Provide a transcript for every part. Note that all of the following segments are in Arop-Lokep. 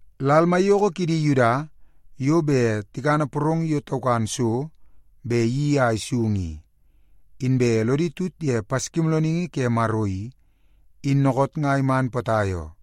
Lal maiyoko kidi Yuda yo bet tikana porong yo taukan so bet iyeii a isung i, inbe lodi tut ye Paskimoolooningi ke Maro i, in dookoot nga iman potai oo.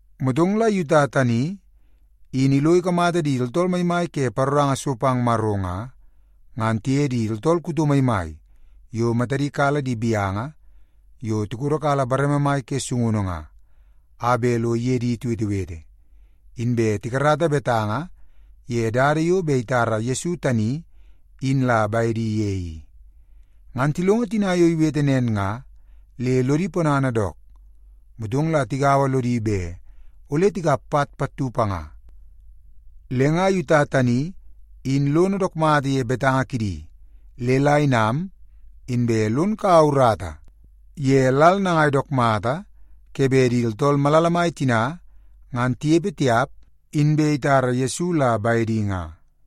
Motong la Yuta tani in ilo ikamata di tooltool maimai ke paroranga so pang Maro nga, ngan tiye di tooltool kuto maimai yo matadi kala di gaunu yo tikodo kala bareme mai ke sungunu nga, a bet lo iye di tiwetewete, inbe tikarata betanga ye dada yo bet itara Yesu tani in la bedi ye i. Ngan tilongo tina yo iwete nen nga le lodi ponana dook, motong la tigaua lodi bet ole tikap pat pattu panga. Le nga Yuta tani in lono dook mata ye betanga kidi le la inam, inbe lon kaua urata ye lal nangai dook mata ke bet di tooltool malala mai tina ngan tinepe tiap, inbe itara Yesu la bedi nga.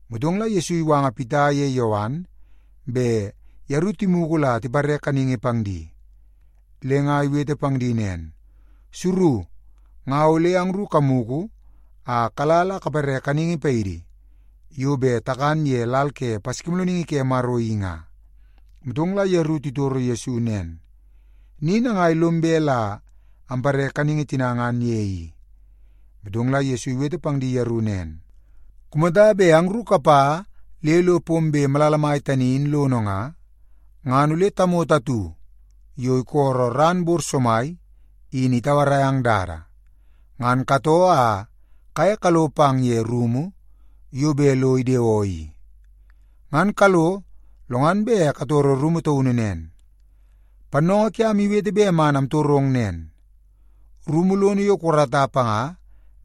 Motong la Yesu iwanga Pita ye Yowan bet yeru timugu la tipare kaningi pang di. Le nga iwete pang di nen, “Suru, nga ole angru kamugu a kala la kapare kaningi paidi yo bet takan ye lal ke Paskimoolooningi ke Maro i nga.” Motong la yeru titoro Yesu nen, “Ni nangai lom bet la ampare kaningi tina ngan ye i?” Motong la Yesu iwete pang di yeru nen, “Kumata bet angru kapa le lo pombe malala mai tani in lono nga, ngan ole tamoto atu yo isolo ran bor somai in itauarai ang dada. Ngan katoo a kaye kalo pang ye rumu yo bet lo idewoo i. Ngan kalo, lo ngan bet katoro rumu taunu nen, ‘Pannoongoo kiam iwete bet man amtorong nen: Rumu lono yo kukarata panga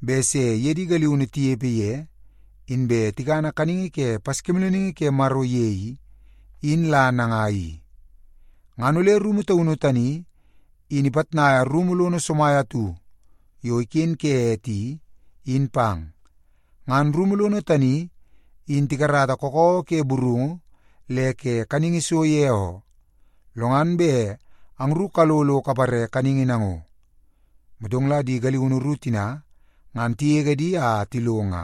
bet se iye di galiunu tinepe ye, inbe tikana kaningi ke Paskimoolooningi ke Maro ye i, in la nangai i?’ Ngan ole rumu taunu tani in ipitnaia rumu lono somai atu yo iken ke ete i, in pang. Ngan rumu lono tani in tikarata kakawa ke burungu le ke kaningi so ye oo. Lo ngan bet angru kalo lo kapare kaningi nango.” Motong la di galiunu ru tina ngan tigege di a tilo nga,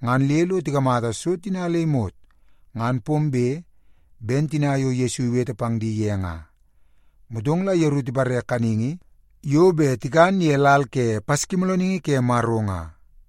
ngan le lo tikamata so tina le imot ngan pombe ben tina yo Yesu iwete pang di ye nga. Motong la yeru tipare kaningi yo bet tikan ye lal ke Paskimoolooningi ke Maro nga.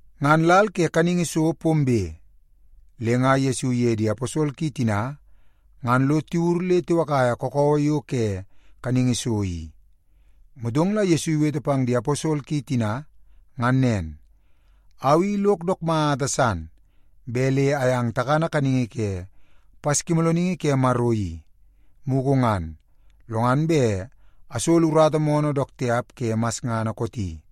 Ngan lal ke kaningi so pombe, le nga Yesu iye di aposol ki tina ngan lo tiwur le tiwakaia kakawa yo ke kaningi so i. Motong la Yesu iwete pang di aposol ki tina ngan nen, “Au i lok dook mata san bet le ayang takana kaningi ke Paskimoolooningi ke Maro i, mugu ngan, lo ngan bet asolo urata moonoo dook tiap ke masngana kooti.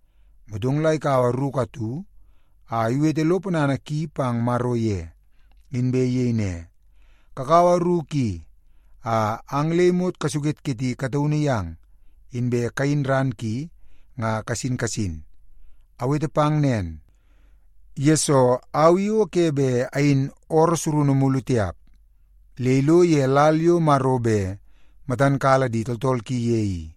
Motong la ikaua ruku atu a iwete lo ponana ki pang Maro ye, inbe iyei ne, “Kakaua ruku i a ang le imot kasuketketi kataunu yang, inbe kayin ran ki nga kasin kasin. Awete pang nen, yesoo au i o ke bet ayin ooroo surunu mulu tiap, le ilo ye lal yo Maro bet matan kala di tooltool ki ye i.”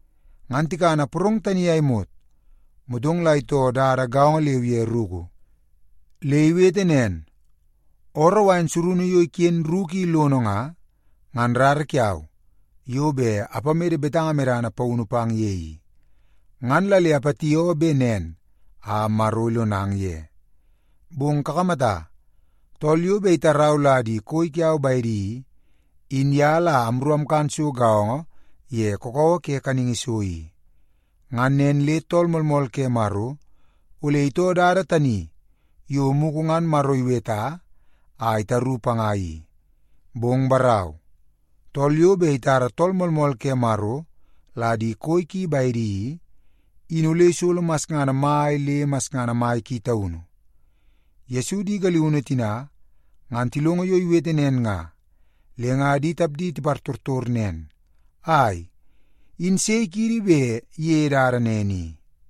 Ngan tikana porong tani a imot, motong la itoo dada gaongo leu ye ruku. Le iwete nen, “Ooroo wain surunu yo iken ruku i lono nga, ngan rara kiau yo bet apamede betanga medana paunu pang ye i. Ngan la le apatioo bet nen a Maro ilonang ye. Bong kakamata! Tool yo bet itarau la di koi kiau bedi i, in ye la amru amkan so gaongo ye kakawa ke kaningi so i. Ngan nen le Tool Moolmool ke Maro ole itoo dada tani yo mugu ngan Maro iweta a itaru panga i. Bong barau, tool yo bet itara Tool Moolmool ke Maro la di koi ki bedi i, in ole isolo masngana mai le masngana mai ki taunu.” Yesu di galiunu tina, ngan tilongo yo iwete nen nga, le nga di tapdi tipartortor nen, “Ai, in sei kiidi bet iyeie dada nen i?”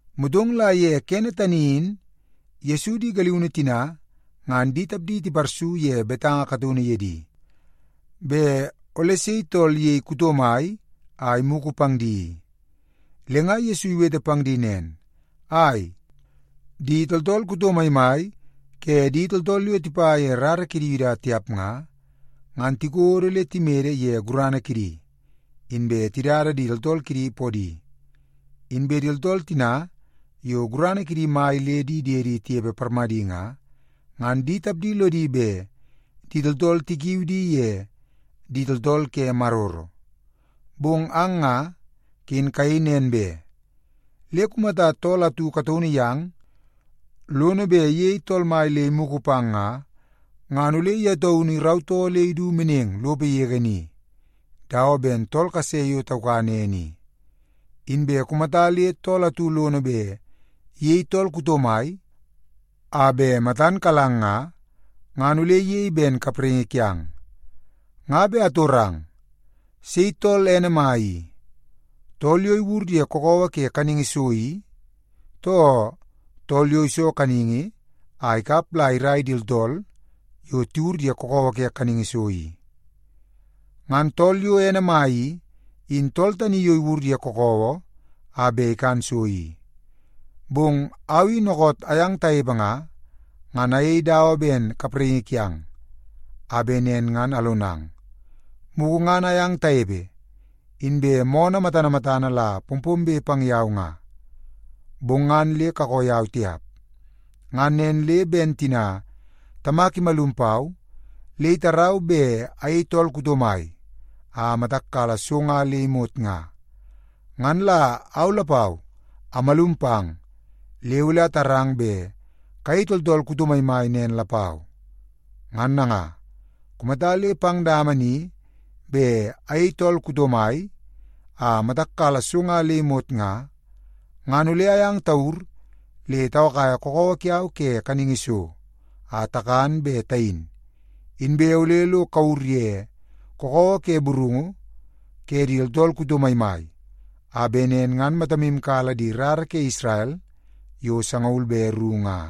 Motong la ye kene tani in Yesu di galiunu tina ngan di tapdi tiparsu ye betanga kataunu ye di, bet ole sei tool iyei kuto mai a imugu pang di i. Le nga Yesu iwete pang di nen, “Ai, di tooltool kuto maimai ke di tooltool yo tipa ye rara kidi Yuda tiap nga, ngan tikodo le timede ye gurana kidi, inbe tidada di tooltool kidi podi. Inbe di tooltool tina yo gurana kidi mai le di diedi tinepe parmadi nga, ngan di tapdi lodi bet di tooltool tikiui di ye ‘Di Tooltool ke Maroro.’ Bong ang nga, ken kayei nen be. Le kumata tool atu kataunu yang lono bet iyei tool mai le imugu pang nga, ngan ole ye taunu irautoo le idu meneng lopo yege ni, dawa ben tool kase yo taukan ene i. Inbe kumata le tool atu lono bet iyei tool kuto mai a bet matan kalang nga, ngan ole iyei ben kapraingi kiang. Nga bet atorang, sei tool ene mai i, tool yo iwur ye kakawa ke kaningi so i, too tool yo iso kaningi a ikap la irai di tooltool yo tiwur ye kakawa ke kaningi so i? Ngan tool yo ene mai i, in tool tani yo iwur ye kakawa a bet ikan so i. Bong au i dookoot ayang tanepe nga, ngan ayei dawa ben kapraingi kiang, a bet nen ngan alonang. Mugu ngan ayang tanepe, inbe moonoo matana matana la pompombe pang yau nga, bong ngan le kakoo yau tiap. Ngan nen le ben tina Tamak imalum pau le itarau bet ayei tool kuto mai a matak kala so nga le imot nga, ngan la au lapau amalum pang le ole atarang bet kayei tooltool kuto maimai nen lapau. Ngan nanga, kumata le pang dama ni bet ayei tool kuto mai a matak kala so nga le imot nga, ngan ole ayang tawur le tawakaia kakawa kiau ke kaningi so a takan be tayin, inbe ole lo kawur ye kakawa ke burungu ke di tooltool kuto maimai, a bet nen ngan matamu kala di rara ke Isrel yo sangaul be ru nga.”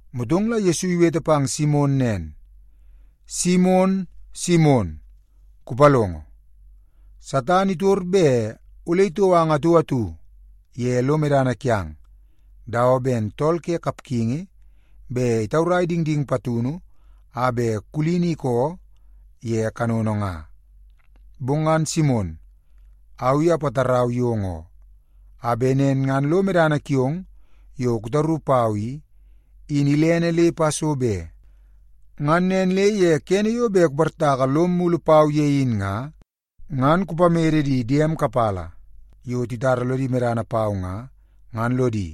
Motong la Yesu iwete pang Simon nen, “Simon, Simon, kupalongo! Satan itor bet ole itou ang atu atu ye lo medana kiang, dawa ben tool ke kapgingi bet itaurai dingding patunu a bet kulini ikoo ye kanono nga. Bong ngan Simon, au i apatarau yong oo, a bet nen ngan lo medana kiong yo kutaru pau i, in ilene le ipa so be. Ngan nen le ye kene yo bet kuportaka lom mulu pau ye in nga, ngan kupamede di diem kapala yo titara lodi medana pau nga, ngan lodi,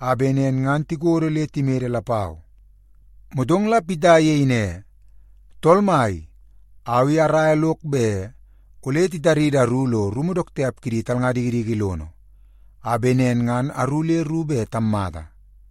a bet nen ngan tikodo le timede lapau.” Motong la Pita iyei ne, “Tool Mai, au i araia lok bet ole titaridi aru lo rumu dook tiap kidi talnga dikidiki lono, a bet nen ngan aru le ru bet tammata.”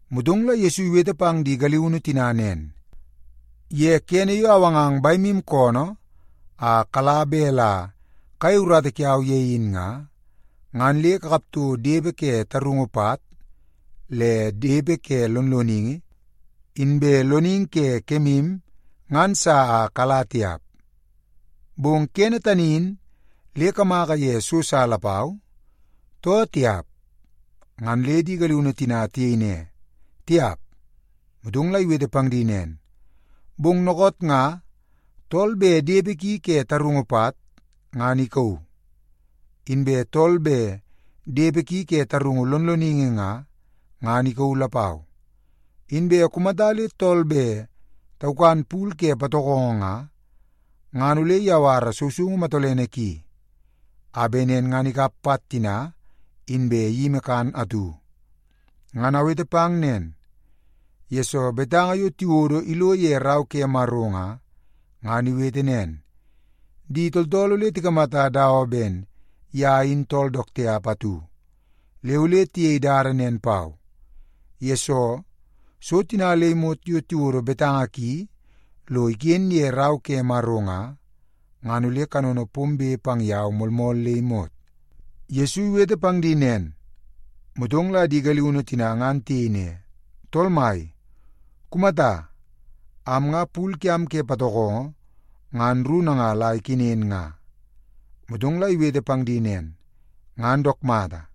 Motong la Yesu iwete pang di galiunu tina nen, “Ye kene yo awangang bemu koonoo a kala bet la kayei urata kiau ye in nga, ngan le kakap toko depe ke tarungu pat, le depe ke lonloningi, inbe loningi ke kemu ngan sa a kala tiap. Bong kene tani in le kamaka ye so sa lapau, too tiap?” Ngan le di galiunu tina tiyei ne, “Tiap.” Motong la iwete pang di nen, “Bong dookoot nga, tool bet depe ki ke tarungu pat, ngan ikauu. Inbe tool bet depe ki ke tarungu lonloningi nga, ngan ikauu lapau. Inbe kumata le tool bet taukan pul ke patokongo nga, ngan ole iyawara sousoungu matolene ki, a bet nen ngan ikap pat tina, inbe iyimi kan atu. Ngan awete pang nen, yesoo betanga yo tiwodo ilo ye Rau ke Maro nga, ngan iwete nen, ‘Di tooltool ole tikamata dawa ben ye in tool dook tiap atu.’ Le ole tiyei dada nen pau, yesoo so tina le imot yo tiwodo betanga ki lo iken ye Rau ke Maro nga, ngan ole kanono pombe pang yau moolmool le imot.” Yesu iwete pang di nen, motong la di galiunu tina ngan tiyei ne, “Tool Mai, kumata! Am nga pul kiam ke patokongo ngan ru nanga la ikenen nga.” Motong la iwete pang di nen, “Ngan dook mata.”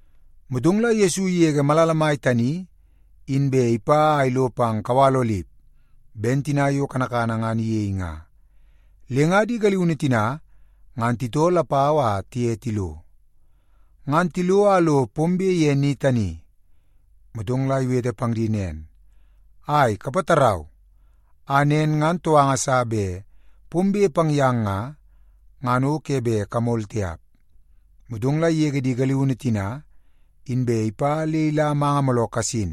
Motong la Yesu igege malala mai tani, inbe ipa a ilo pang kawal Olip ben tina yo kanakana ngan iyei nga. Le nga di galiunu tina ngan titoo lapau a tiye tilo. Ngan tilo a lo pombe ye ni tani, motong la iwete pang di nen, “Ai, kapatarau, a nen ngan touanga sa bet pombe pang yang nga, ngan o ke bet kamol tiap.” Motong la igege di galiunu tina, inbe ipa le ila manga mooloo kasin,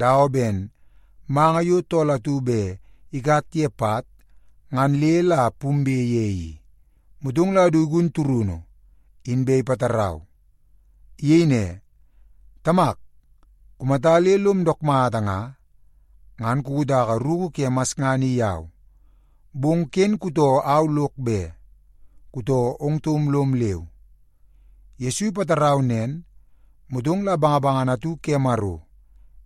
dawa ben manga yo tool atu bet ikat ye pat ngan le la pumbe ye i. Motong la du igun turunu, inbe ipatarau. Iyei ne, “Tamak, kumata le lom dook mata nga, ngan kukutaka ruku ke masngana i yau. Bong ken kutoo au lok be, kutoo ong taum lom leu.” Yesu ipatarau nen, motong la bangabangana atu ke Maro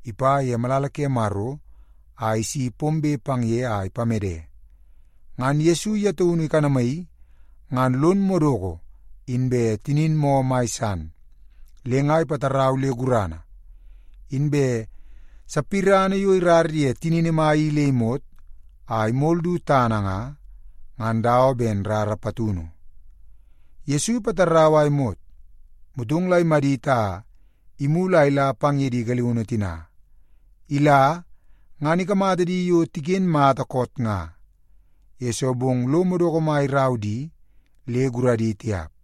ipa ye malala ke Maro a isi pombe pang ye a ipamede. Ngan Yesu ye taunu ikanamaii ngan lon madoko inbe tinin moo mai san, le nga ipatarau le gurana. Inbe sapirana yo irar ye tinini mai i le imot a imol du tana nga, ngan dawa ben rara patunu. Yesu ipatarau a imot, motong la imadit a imulu a ila pang ye di galiunu tina. Ila, ngan ikamata di yo tiken mata koot nga, yesoo bong lo madoko mai irau di le guradi tiap.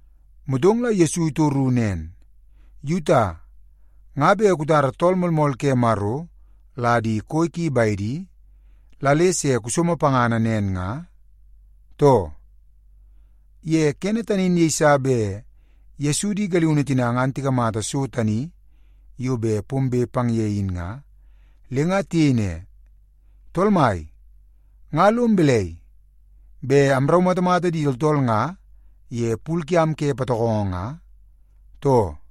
Motong la Yesu itoru nen, “Yuta, nga bet kutara Tool Moolmool ke Maro la di koi ki bedi, la le se kusomo pangana nen nga, too?” Ye kene tani in yeiso bet Yesu di galiunu tina ngan tikamata so tani yo bet pombe pang ye i, le nga tiyei ne, “Tool Mai, nga lom balai, bet amraumatamata di tooltool nga ye pul kiam ke patokongo nga, too?”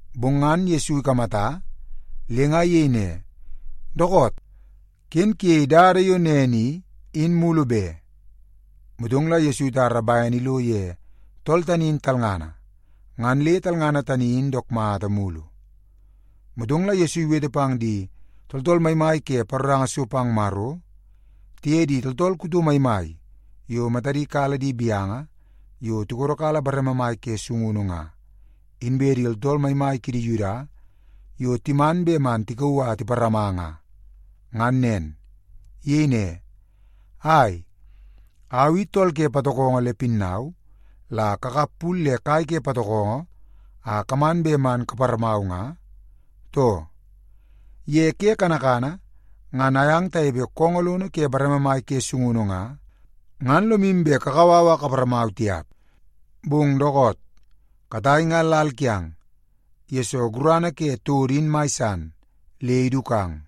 Bong ngan Yesu ikamata, le nga iyei ne, “Dookoot! Ken kuyei dada yo nen i, in mulu be.” Motong la Yesu itara bene ilo ye tool tani in talngana, ngan le talngana tani in dook mata mulu. Motong la Yesu iwete pang di tooltool maimai ke paroranga so pang Maro, tiye di tooltool kuto maimai yo matadi kala di gaunu yo tikodo kala bareme mai ke sungunu nga, inbe di tooltool maimai kidi Yuda yo timan bet man tikauu a tiparama nga, ngan nen. Iyei ne, “Ai, au i tool ke patokongo le pinnau la kakap pul le kai ke patokongo a kaman bet man kaparamau nga, too? Ye ke kanakana ngan ayang tanepe koongoo lono ke bareme mai ke sungunu nga, ngan lomu bet kakau au a kaparamau tiap. Bong dookoot, katai nga lal kiang, yesoo gurana ke todo in mai san, le idukang.”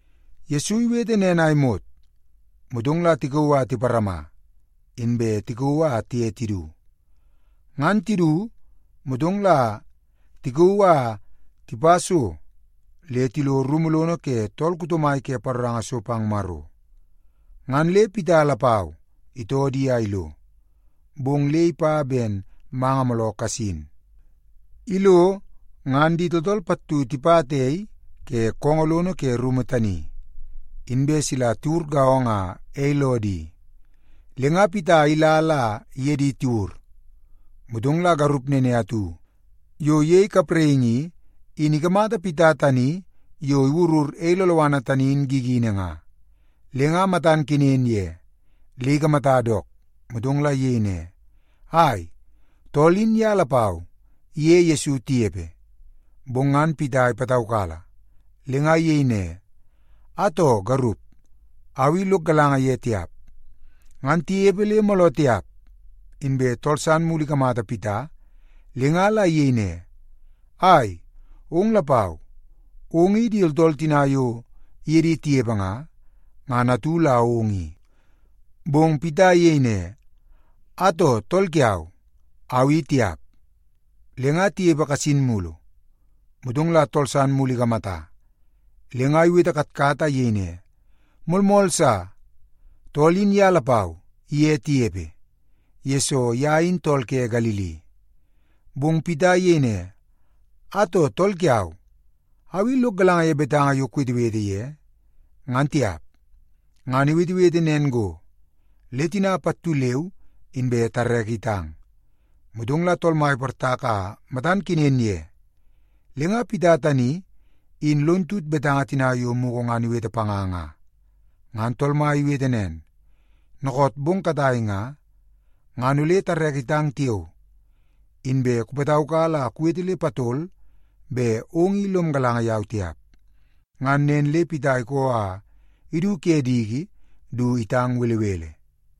Yesu iwete nen a imot, motong la tikauu a tiparama, inbe tikauu a tiye tidu. Ngan tidu, motong la tikauu a tipa so le tilo rumu lono ke tool kuto mai ke paroranga so pang Maro. Ngan le Pita lapau itoo di a ilo, bong le ipa ben manga mooloo kasin. Ilo, ngan di tooltool pattu tipata ei ke koongoo lono ke rumu tani, inbe sila tiwur gaongo a ei loo di. Le nga Pita ila la iye di tiwur. Motong la garup nene atu yo iyei kapraingi i, in ikamata Pita tani yo iwurur ei loloana tani in gigini nga, le nga matan kenen ye le ikamata dook, motong la iyei ne, “Ai, tool in ye lapau iye Yesu tinepe.” Bong ngan Pita ipataukala, le nga iyei ne, “Atoo, garup, au i lok galanga ye tiap.” Ngan tinepe le mooloo tiap, inbe tool san mulu ikamata Pita le nga la iyei ne, “Ai, ong lapau, ong i di tooltool tina yo iye di tinepe nga, ngan atu la ong i.” Bong Pita iyei ne, “Atoo, tool kiau, au i tiap.” Le nga tinepe kasin mulu, motong la tool san mulu ikamata, le nga iwete katkat a iyei ne, “Moolmool sa, tool in ye lapau iye tinepe, yesoo ye in tool ke Galili.” Bong Pita iyei ne, “Atoo, tool kiau, au i lok galanga ye betanga yo kuwetewete ye, ngan tiap!” Ngan iwetewete nen go, le tina pattu leu inbe tareke itang. Motong la Tool Mai iportak a matan kenen ye. Le nga Pita tani in lon tut betanga tina yo mugu ngan iwete panga nga. Ngan Tool Mai iwete nen, “Dookoot bong katai nga, ngan ole tareke itang tiao, inbe kupataukala a kuwete le patol bet ong i lom galanga yau tiap.” Ngan nen le Pita ikoo a idu ke diki du itang belebele.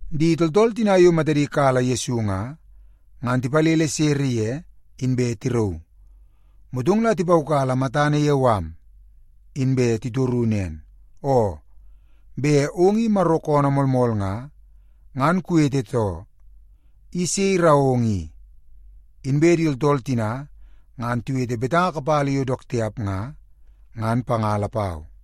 Di tooltool tina yo matadi kala Yesu nga, ngan tipalele sere ye, inbe tirauu. Motong la tipaukala matana ye mala, inbe titoru nen, “Oo, bet ong i Maro koonoo moolmool nga, ngan kuwete too. I sei irau ong i?” Inbe di tooltool tina ngan tiwete betanga kapala yo dook tiap nga, ngan panga lapau.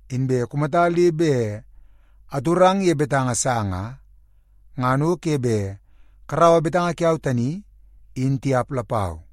Inbe kumata le bet atorang ye betanga sa nga, ngan o ke bet karaua betanga kiau tani, in tiap lapau.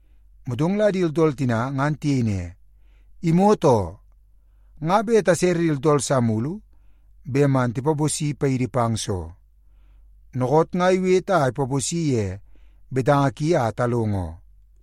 Motong la di tooltool tina ngan tiyei ne, “Imot oo! Nga bet tasere di tooltool sa mulu bet man tipaposi paidi pang soo? Dookoot nga iwete a ipaposi ye betanga ki a talongo oo.”